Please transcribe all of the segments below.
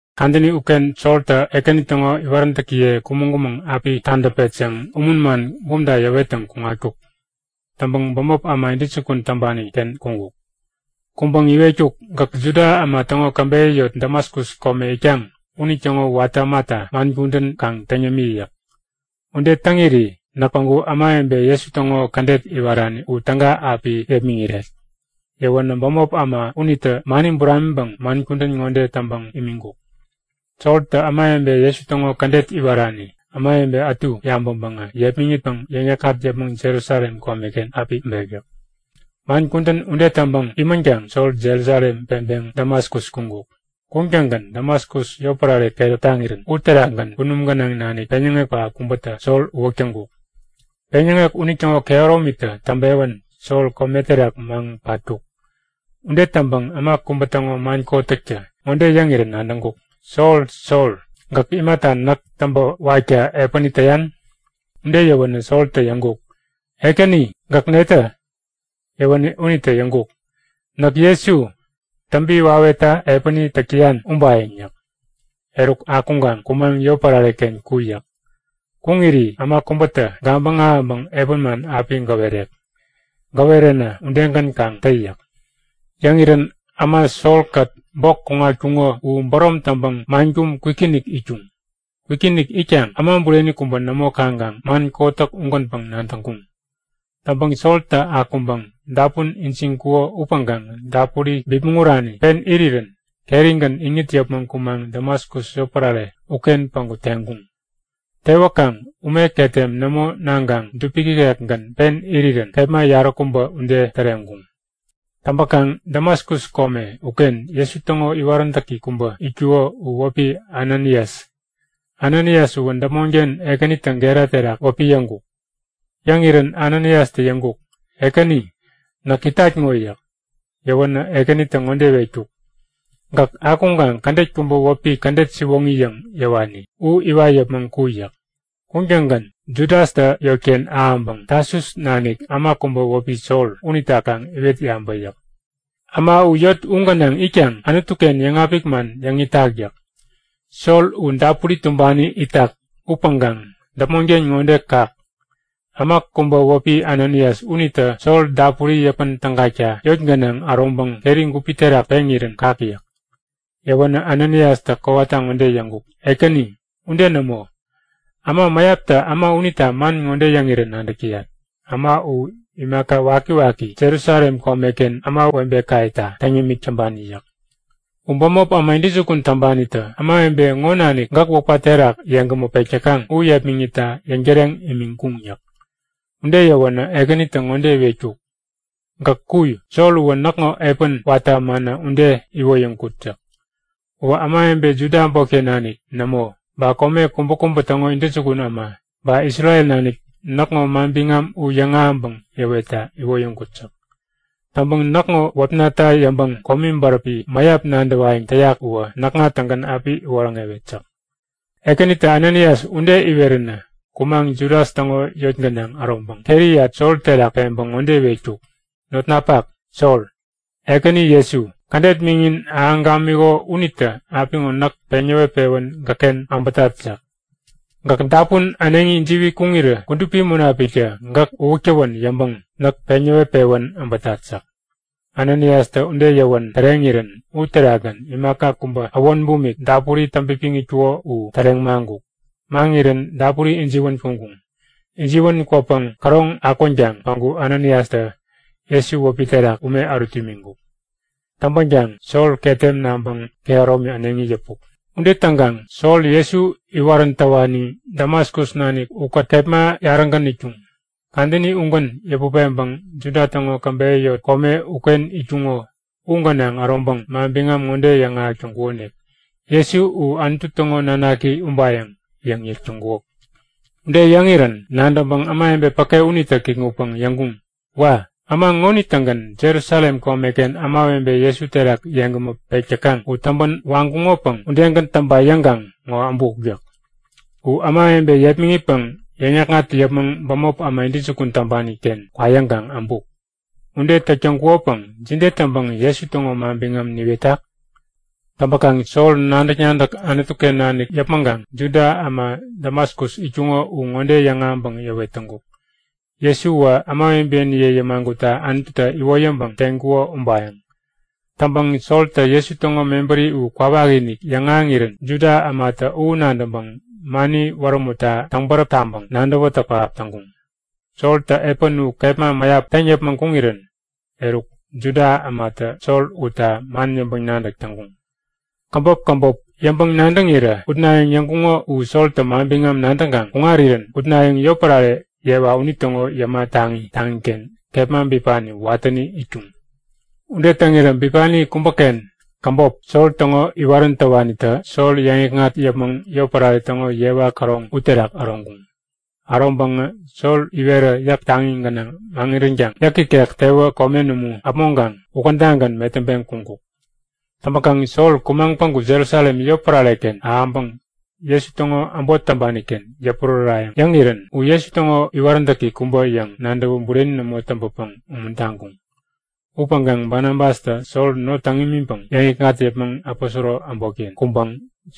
Kadäni uken Soltä Ekäni täŋo iwaräntäkiye kumäŋ-kumäŋ api tadäpet yäŋ umun man bumta yäwettäŋ kuŋatkuk. Täŋpäŋ bämop äma intäjukun täŋpani-ken kuŋkuk. Kuŋpäŋ iwetkuk; Gäk Juda äma täŋo käbeyä yot Damaskus kome itkaŋ unitäŋo watä ämata man kudän kaŋ täŋ yämi yäk. Ude täŋiri näk päŋku ämawebe Jesu täŋo kädet iwarani u täga api yepmäŋiret. Yäwänä bämop äma unitä mani buramiŋpäŋ man kudän ŋode täŋpäŋ imiŋkuk; Soltä ämawebe Jesu täŋo kädet iwarani ämawebe ätu yabäŋpäŋä yepmäŋitpäŋ yäŋ-yäkŋat yäpmäŋ Jerusalem komeken api äbek yäk. Man kudän ude täŋpäŋ imänkaŋ Sol Jerusalem peŋpäŋ Damaskus kuŋkuk. Kuŋtäŋgän Damaskus yotpärare keräp taŋirän uterakgän kunum gänaŋ nanik peŋyäŋek pähap kubätä Sol uwäk täŋkuk. Peŋyäŋek unitäŋo kehäromitä täŋpewän Sol kome terak maŋpatkuk. Ude täŋpäŋ äma kubä täŋo man kotäktä ŋode yäŋirän nadäŋkuk; Sol! Sol! Gäk imata näk täŋpä wakta epäni täyan? Ude yäwänä Soltä yäŋkuk; Ekäni, gäk netä? Yäwänä unitä yäŋkuk; Näk Jesu, täŋpi wawetta epäni täk täyan ubayäŋ yäk. Eruk, akuŋkaŋ kumaŋ yotpärare-ken ku yäk. Kuŋiri äma kubätä gabäŋ ahäŋpäŋ epän man api gäwerek. Gäweränä udegän kaŋ tä yäk. Yäŋirän äma Sol-kät bok kuŋatkuŋo u bärom täŋpäŋ man kum kwikinik itkuŋ. Kwikinik itkaŋ äma bureni kubä nämo kaŋkaŋ man kotäk ugänpäŋ nadäŋkuŋ. Täŋpäŋ Soltä akuŋpäŋ dapun ijiŋkuko upäŋkaŋ dapuri bipmäŋ urani pen irirän kerigän iŋit yäpmäŋ kumaŋ Damaskus yotpärare uken päŋku teŋkuŋ. Tewäkaŋ ume ketem nämo naŋkaŋ dupik ikekgän pen irirän kepma yaräkubä ude täreŋkuŋ. Täŋpäkaŋ Damaskus kome uken Jesu täŋo iwaräntäki kubä itkuko u wäpi Ananias. Ananias uwä däpmonken Ekänitä gera terak wäpi yäŋkuk. Yäŋirän Ananiastä yäŋkuk; Ekäni, näk itat ŋo yäk. Yäwänä Ekänitä ŋode iwetkuk; Gäk akuŋkaŋ kädet kubä wäpi Kädet Siwoŋi yäŋ yäwani u iwat yäpmäŋ ku yäk. Kuŋtäŋgän Judastä yotken ahäŋpäŋ Tasus nanik äma kubä wäpi Sol unita kaŋ iwet yabä yäk. Äma u yot u gänaŋ itkaŋ Anutu-ken yäŋapik man yäŋ itak yäk. Sol u dapuri tumbani itak upäŋkaŋ däpmonken ŋode kak; Äma kubä wäpi Ananias unitä Sol dapuri yäpän tägakta yot gänaŋ äroŋpäŋ keri gupi terak peŋirän kak yäk. Yäwänä Ananiastä kowata ŋode yäŋkuk; Ekäni, ude nämo! Äma mäyaptä äma unita man ŋode yäŋirä nadäk täyat; Äma u imaka wakiwaki Jerusalem komeken ämawebekayeta täŋ yämik täŋpani yäk. U bämop äma intäjukun täŋpanitä ämawebe ŋo nanik gäk wäpka terak yeŋgämä pek täkaŋ u yepmäŋitta yäŋtäreŋ imiŋkuŋ yäk. Ude yäwänä Ekänitä ŋode iwetkuk; Gäk ku. Sol uwä näkŋo epän watä ämana ude iwoyäŋkut yäk. Uwä ämawebe Juda äbotken nanik nämo, ba kome kubäkubä täŋo intäjukun äma, ba Isrel nanik näkŋo manbiŋam u yäŋahäŋpäŋ yäwetta iwoyäŋkut yäk. Täŋpäŋ näkŋo wäpnata yäŋpäŋ komi bäräpi mäyap nadäwayäŋ täyak uwä näkŋa-tägän api iwoŋärewet yäk. Ekänitä Ananias ude iweränä kumaŋ Judas täŋo yot gänaŋ äroŋpäŋ keriyat Sol terak peŋpäŋ ŋode iwetkuk; Notnapak Sol, Ekäni Jesu, kädet miŋin ahäŋ gamiŋkuko unitä apiŋo näk peŋ näwet-pewän gäkken äbätat yäk. Gäk dapun äneŋi ijiwi kuŋirä Kudupi Munapiktä gäk uwäk tawän yäŋpäŋ näk peŋ näwet-pewän äbätat yäk. Ananiastä ude yäwän täreŋirän uterakgän imaka kubä äwon bumik dapuri täŋpipiŋkuko u täreŋ maŋkuk. Maŋirän dapuri ijiwän kuŋkuŋ. Ijiwän kwäpäŋ käroŋ akwänkaŋ päŋku Ananiastä Jesu wäpi terak ume ärut imiŋkuk. Täŋpänkaŋ Sol ketem naŋpäŋ kehäromi äneŋi yäpuk. Ude täŋkaŋ Sol Jesu iwarän täwani Damaskus nanik ukät kepma yarägän itkuŋ. Kadäni ugän yäput peŋpäŋ Juda täŋo käbeyä yot kome uken itkuŋo u gänaŋ äroŋpäŋ manbiŋam ŋode yäŋahäk täŋkukonik; Jesu u Anutu täŋo nanaki ubayäŋ yäŋ yäk täŋkuk. Ude yäŋirän nadäŋpäŋ ämawebe päke unitä kikŋutpäŋ yäŋkuŋ; Wa! Äma ŋonitä-gän Jerusalem komeken ämawebe Jesu terak yeŋgämä pek täkaŋ u täŋpän waŋkuŋopäŋ udegän täŋpa yäŋkaŋ ŋo äbuk yäk. U ämawebe yepmäŋitpäŋ yäŋ-yäkŋat yäpmäŋ bämop äma intäjukun täŋpani-ken kwa yäŋkaŋ äbuk. Ude täk täŋkukopäŋ jide täŋpäŋ Jesu täŋo manbiŋam niwetak? Täŋpäkaŋ Sol nadäk-nadäk Anutu-ken nanik yäpmäŋkaŋ Juda äma Damaskus itkuŋo u ŋode yäŋahäŋpäŋ yäwet täŋkuk; Jesuwä ämawebeniye yämagutta Anututä iwoyäŋpäŋ teŋkuko ubayäŋ. Täŋpäŋ Soltä Jesu täŋo mebäri u kwawakinik yäŋahäŋirän Juda ämatä u nadäŋpäŋ mani wärämutta täŋbäräp taŋpäŋ nadäwätäk pähap täŋkuŋ. Soltä epän u kepma mäyap täŋ yäpmäŋ kuŋirän eruk, Juda ämatä Sol utta man yäŋpäŋ-nadäk täŋkuŋ. Käbop käbop yäŋpäŋ-nadäŋirä utnayäŋ yäŋkuŋo u Soltä manbiŋam nadäŋkaŋ kuŋarirän utnayäŋ yotpärare yewa unitäŋo yäma taŋi taŋiken kepma bipani watäni itkuŋ. Ude täŋirä bipani kubäken käbop, Sol täŋo iwarän täwanitä Sol yäŋikŋat yäpmäŋ yotpärare täŋo yewa käroŋ uterak äroŋkuŋ. Äroŋpäŋä Sol iwerä yäk taŋi gänaŋ mäŋiränkaŋ yäk ikek tewä komen umu äpmoŋkaŋ ukädagän metäŋpeŋ kuŋkuk. Täŋpäkaŋ Sol kumaŋ päŋku Jerusalem yotpärare-ken ahäŋpäŋ Jesu täŋo äbot täŋpani-ken yäpurärärayäŋ yäŋirän u Jesu täŋo iwaräntäki kubä yäŋ nadäwä bureni nämo täŋpäpäŋ umuntaŋkuŋ. Upäŋkaŋ Banabastä Sol not täŋ imiŋpäŋ yäŋikŋat yäpmäŋ aposoro äbotken kuŋpäŋ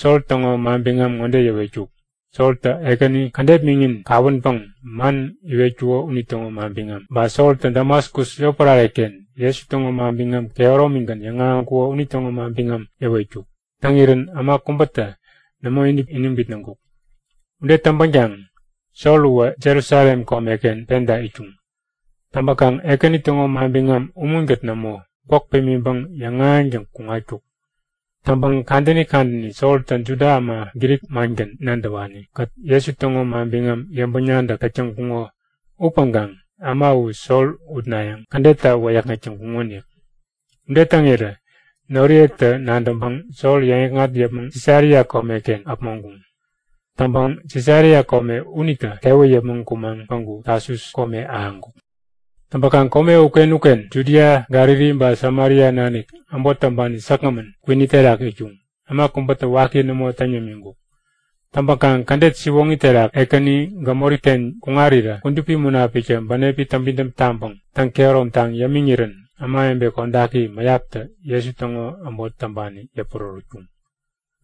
Sol täŋo manbiŋam ŋode yäwetkuk; Soltä Ekäni kädet miŋin kawänpäŋ man iwetkuko unitäŋo manbiŋam, ba Soltä Damaskus yotpärare-ken Jesu täŋo manbiŋam kehäromigän yäŋahäŋkuko unitäŋo manbiŋam yäwetkuk. Täŋirän äma kubätä nämo iniŋ bitnäŋkuk. Ude täŋpänkaŋ Sol uwä Jerusalem komeken penta itkuŋ. Täŋpäkaŋ Ekäni täŋo manbiŋam umunkät nämo, gwäk pimiŋpäŋ yäŋahäŋtäŋ kuŋatkuk. Täŋpäŋ kadäni kadäni Soltä Juda äma Grik mangän nadäwani-kät Jesu täŋo manbiŋam yäŋpäŋ-nadäk täk täŋkuŋo upäŋkaŋ äma u Sol utnayäŋ kädetta wäyäkŋek täŋkuŋonik. Ude täŋirä noriyetä nadäŋpäŋ Sol yäŋikŋat yäpmäŋ Sisaria komeken äpmoŋkuŋ. Täŋpäŋ Sisaria kome unitä tewä yäpmäŋ kumaŋ päŋku Tasus kome ahäŋkuk. Täŋpäkaŋ kome uken-uken, Judia, Galili ba Samaria nanik äbot täŋpani säkgämän, kwini terak itkuŋ. Äma kubätä waki nämo täŋ yämiŋkuk. Täŋpäkaŋ kädet siwoŋi terak Ekäni gämori-ken kuŋarirä Kudupi Munapiktä bänepi täŋpidäm taŋpäŋ täŋ-kehäromtaŋ yämiŋirän ämawebe kodaki mäyaptä Jesu täŋo äbot täŋpani yäpurärätkuŋ.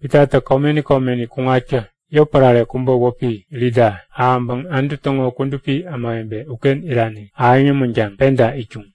Pitatä komeni komeni kuŋatkä yotpärare kubä wäpi Lida ahäŋpäŋ Anutu täŋo kudupi ämawebe uken irani ahäŋ yämänkaŋ penta itkuŋ.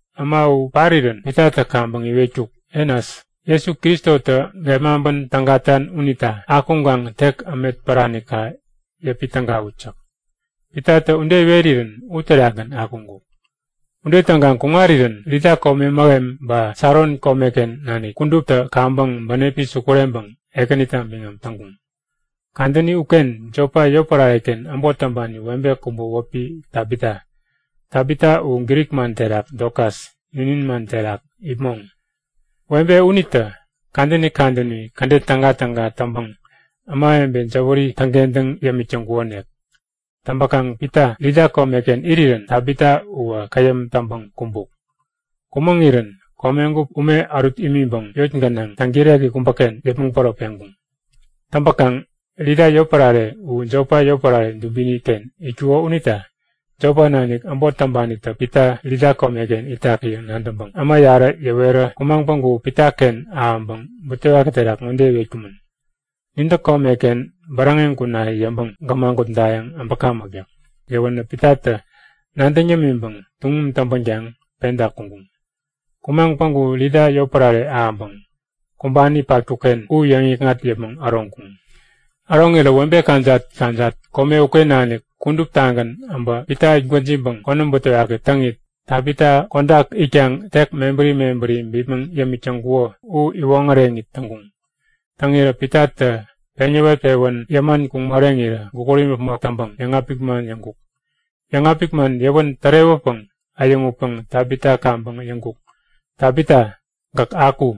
Äma u parirän Pitatä kaŋpäŋ iwetkuk; Enas, Jesu Kristotä gepmaŋpän tägatan unita akuŋkaŋ tek ämetpäranika yäpi tägawut yäk. Pitatä ude iwerirän uterakgän akuŋkuk. Ude täŋkaŋ kuŋarirän Lida kome mähem ba Saron komeken nanik kuduptä kaŋpäŋ bänepi sukureŋpäŋ Ekänita biŋam täŋkuŋ. Kadäni uken Jopa yotpärare-ken äbot täŋpani webe kubä wäpi Tabita. (Tabita u Grik man terak Dokas, ninin man terak ipmoŋ.) Webe unitä kadäni kadäni kädet tägatäga täŋpäŋ ämawebe jäwäri täŋkentäŋ yämik täŋkukonik. Täŋpäkaŋ Pita Lida komeken irirän Tabita uwä käyäm täŋpäŋ kumbuk. Kumäŋirän komegup ume ärut imiŋpäŋ yot gänaŋ täŋkireki kubäken yäpmäŋ päro peŋkuŋ. Täŋpäkaŋ Lida yotpärare u Jopa yotpärare dubini-ken itkuko unita Jopa nanik äbot täŋpanitä Pita Lida komeken itak yäŋ nadäŋpäŋ äma yarä yäwerä kumaŋ päŋku Pitaken ahäŋpäŋ butewaki terak ŋode iwetkumän; Nintä komeken bäräŋeŋ kuna yäŋpäŋ gämagutdayäŋ äbäkamäk yäk. Yäwänä Pitatä nadäŋ yämiŋpäŋ tuŋum täŋpänkaŋ penta kuŋkuŋ. Kumaŋ päŋku Lida yotpärare ahäŋpäŋ kumbani patkuk-ken u yäŋikŋat yäpmäŋ äroŋkuŋ. Äroŋirä webe kajat-kajat kome uken nanik kuduptagän äbä Pita itgwäjiŋpäŋ konäm butewaki täŋit, Tabita kodak itkaŋ tek mebäri mebäri bipmäŋ yämik täŋkuko u iwoŋäreŋit täŋkuŋ. Täŋirä Pitatä peŋ yäwet-pewän yäman kuŋ moreŋirä gukut imäpmok täŋpäŋ yäŋapik man yäŋkuk. Yäŋapik man yäwän tärewäpäŋ äyäŋutpäŋ Tabita kaŋpäŋ yäŋkuk; Tabita, gäk aku!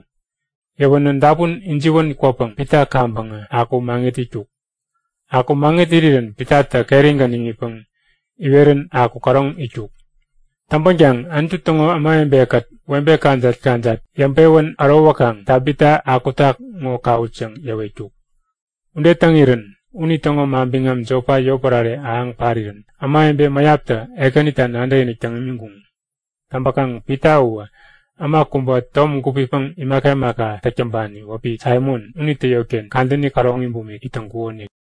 Yäwänä dapun ijiwän kwäpäŋ Pita kaŋpäŋä akuŋ maŋit itkuk. Aku maŋirirän Pitatä kerigän iŋitpäŋ iwerän aku käroŋ itkuk. Täŋpänkaŋ Anutu täŋo ämawebe-kät webe kajat-kajat yäŋpewän ärowäkaŋ Tabita akutak ŋo kawut yäŋ yäwetkuk. Ude täŋirän unitäŋo manbiŋam Jopa yotpärare ahäŋ parirän ämawebe mäyaptä Ekänita nadäkinik täŋ imiŋkuŋ. Täŋpäkaŋ Pita uwä äma kubä tom gupipäŋ imaka imaka täk täŋpani wäpi Saimon unitä yotken kadäni käroŋi bumik it täŋkumänonik.